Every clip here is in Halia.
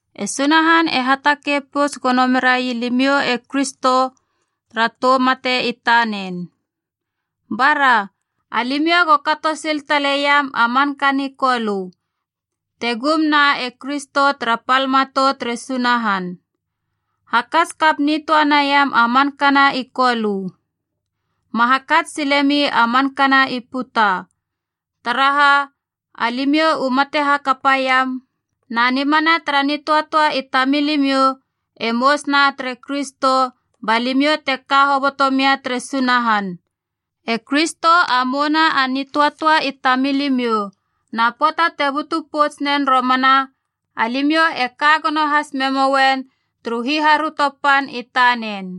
E Sunahan e hatakei pouts gono mera ii limiou e Kristo tara tou mate i tanen. Bara! Alimiou go kato sil taleiam a manka ni Kolö, te gumna e Kristo tara pal matou tere Sunahan. Hakats kap nitöa naiam a mankana i Kolö. Ma hakats silemi a mankana i puta. Taraha, alimiou u mate hakapaiam, na nimana tara nitöatöa i tamilimiou e mousuna tere Kristo ba limiou te ka hoboto mia tere Sunahan. E Kristo a mouna a nitöatöa i tamilimiou, na pöata te butu pouts nen romana, alimiou e ka gono has memouen turu hiharöto pan i tanen.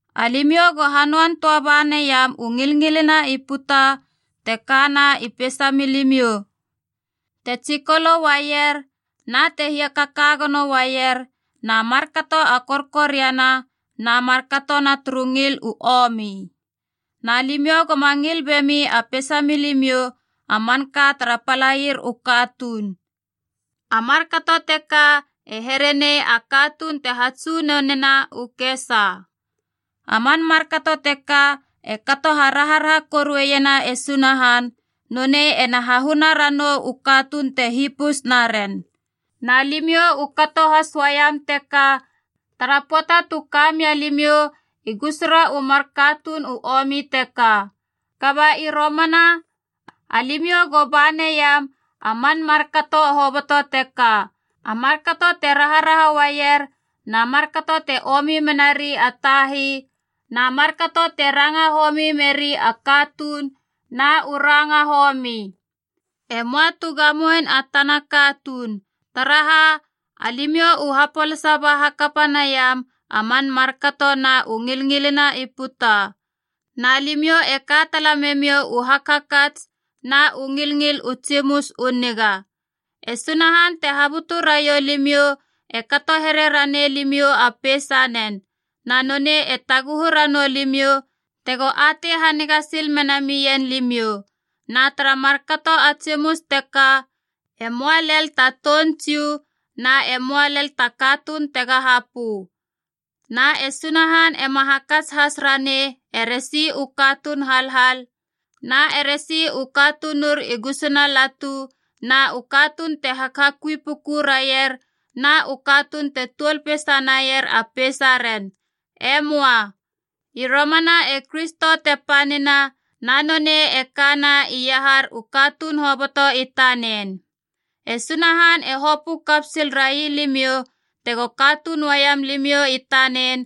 Alimiou go hanöan töa baneiam u ngilngilina i puta te kana i peisa milimiou: te tsikolo uaier na te hiakaka gono uaier, na markato a korkoriana, na markato na turu ngil u omi. Na limiou goma ngil bemi a peisamiou a manka tara palair u katuun. A markato teka e here nei a katuun te hatsunonena u kesa. A man markato teka e kato haraharaha koruena e Sunahan, nonei ena hahuna ranou u katuun te hipus naren. Na limiou u kato has uaiam teka tara pöata tu kamia limiou i gusura u mar katuun u omi teka. Kaba i romana alimiou go ba naiam a man markato hoboto teka: a markato te raharaha uaier na markato te omi menari a tai na markato te ranga homi meri a katuun na u ranga homi. E möa tu gamoein a tana katuun, taraha alimiou u hapolasa ba hakapa niam a man markato na u ngilngilina i puta. Na limiou e ka tala memiou u hakhakats na u ngilngil u tsimus u niga. E Sunahan te habutu raiou limiou e kato here ranei limiou a peisanen. Na nonei e taguhu ranou limiou tego atei haniga sil mena mien limiou. Na tara markato a tsimus teka, e möa lel ta toun Jiu na e möa lel ta katuun tega hapö. Na e Sunahan ema hakats has ranei eresi u katuun halhal na eresi u katunur i gusuna latu na u katuun te hakhakui puku raier na u katuun te tuol peisa naier a peisaren. E möa. I romana e Kristo te panina na nonei e kana iahar u katuun hoboto i tanen. E Sunahan e hopö kap sil railimiou tego katuun uaiam limiou i tanen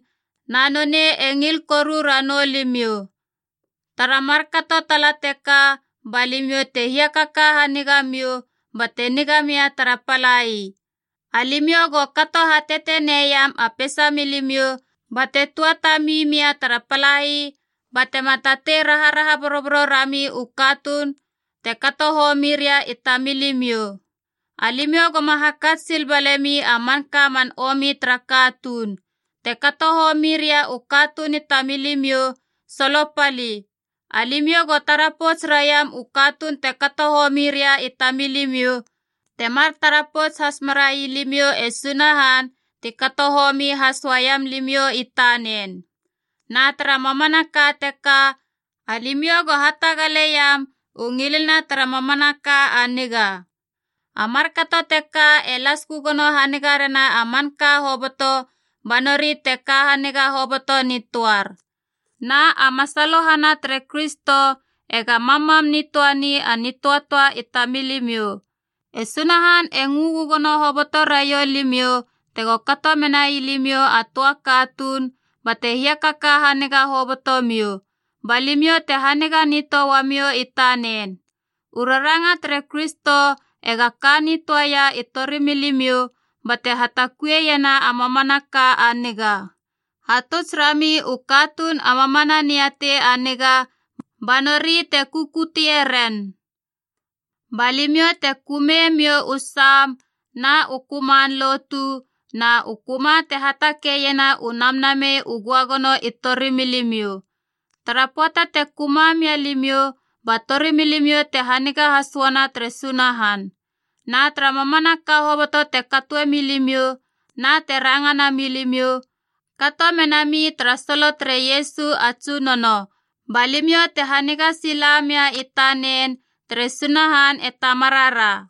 na nonei e ngil koru ranou limiou. Tara markato tala teka ba limiou te hiakaka haniga miou bate niga mia tara palai. Alimiou go kato hateteneiam a peisa milimiou bate tuatami mia tara palai batema tatei raraha boroboro rami u katuun te kato homiria i tamiliou. Alimiou goma hakats sil balemi a manka man omi tara katuun. Te kato homiria u katuun i tamilimiou, solopali. Alimiou go tara pouts raiam u katuun te kato homiria i tamilimiou, temar tara pouts has merai limiou e Sunahan ti kato homi has uaiam limiou i tanen. Na tara mamanaka teka, alimiou go hatagaleiam u ngilina tara mamanaka a niga. A markato teka e las gögono haniga rena a manka hoboto ba nori te ka haniga hoboto nitöar. Na a masalohana tere Kristo ega mammam nitöani a nitöatöa i tamilimiou. E Sunahan e ngö gögono hoboto raiou limiou tego kato menai limiou a töa a katuun bate hiakaka haniga hoboto miou. Ba limiou te haniga nitöa uamiou i tanen. U raranga tere Kristo ega ka nitöaia i torimilimiou bate hatakuieiena a mamanaka a niga. Hatuts rami u katuun a mamana niatei a niga ba nori te kukutie ren. Ba limiou te kömemiou u sam na u köman lotu na u köma te hatakeiena u namnamei u göagono i torimilimiou. Tara pöata te köma mia limiou, ba torimilimiou te haniga has uana tere Sunahan. Na tara mamanaka hoboto te katoe milimiou na te ranga namilimiou, kato mena mi tara solo tere Iesu a Tsunono ba limiou te haniga sila mia i tanen tere Sunahan e Tamarara.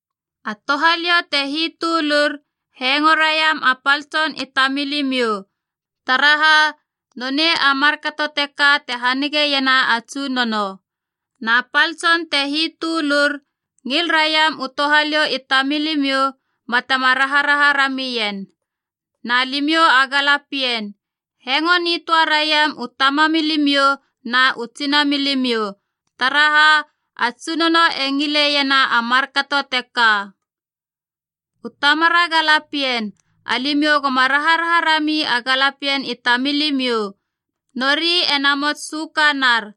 A touhaliou te hitölur, hengo raiam a pal tsona i tamilimiou, taraha nonei a markato teka te hanigeiena a Tsunono. Na pal tson te hitölur, ngil raiam a touhaliou i tamilimiou batema raharaha ramien. Na limiou a galapien, hengo nitöa raiam u tamamilimiou na u tsinamilimiou, taraha a Tsunono e ngileiena a markato teka. U tamara galapien, alimiou goma raharaha rami a galapien i tamilimiou. Nori e namots sökanar.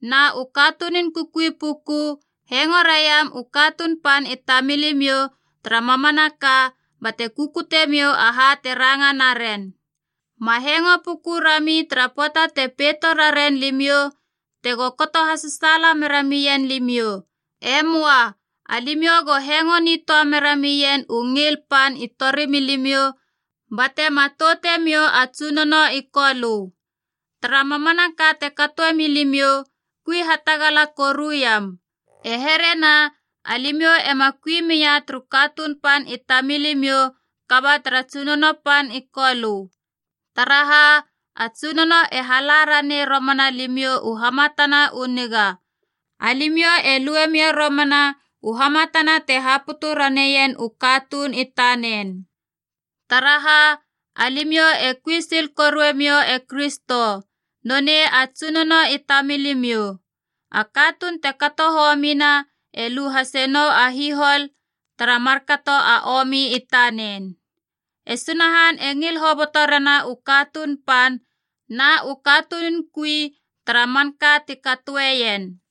Na u katunun kukui puku, hengo raiam u katuun pan i tamilimiou tara mamanaka bate kukutemiou aha te ranga naren. Ma hengo puku rami tara pöata te peito rarien limiou tego kato hasasaala mera mien limiou. E möa. Alimiou go hengo nitöa mera mien u ngil pan i torimilimiou bate matoutemiou a Tsunono i Kolö. Tara mamanaka te katoe milimiou, kui hatagala koruiam. E here na alimiou ema kui mia turu katuun pan i tamilimiou kaba tara Tsunono pan i Kolö. Taraha, a Tsunono e hala ranei romana limiou u hamatanab u niga. Alimiou e luemiou romana u hamatana te haputu raneien u katuun i tanen. Taraha, alimiou e kui sil korue miou e Kristo. Nonei a Tsunono i tamilimiou. A katuun te kato homina e lu hase nou a hihol tara markato a omi i tanen. E Sunahan e ngil hoboto rena u katuun pan na u katunun kui tara manka ti katoeien.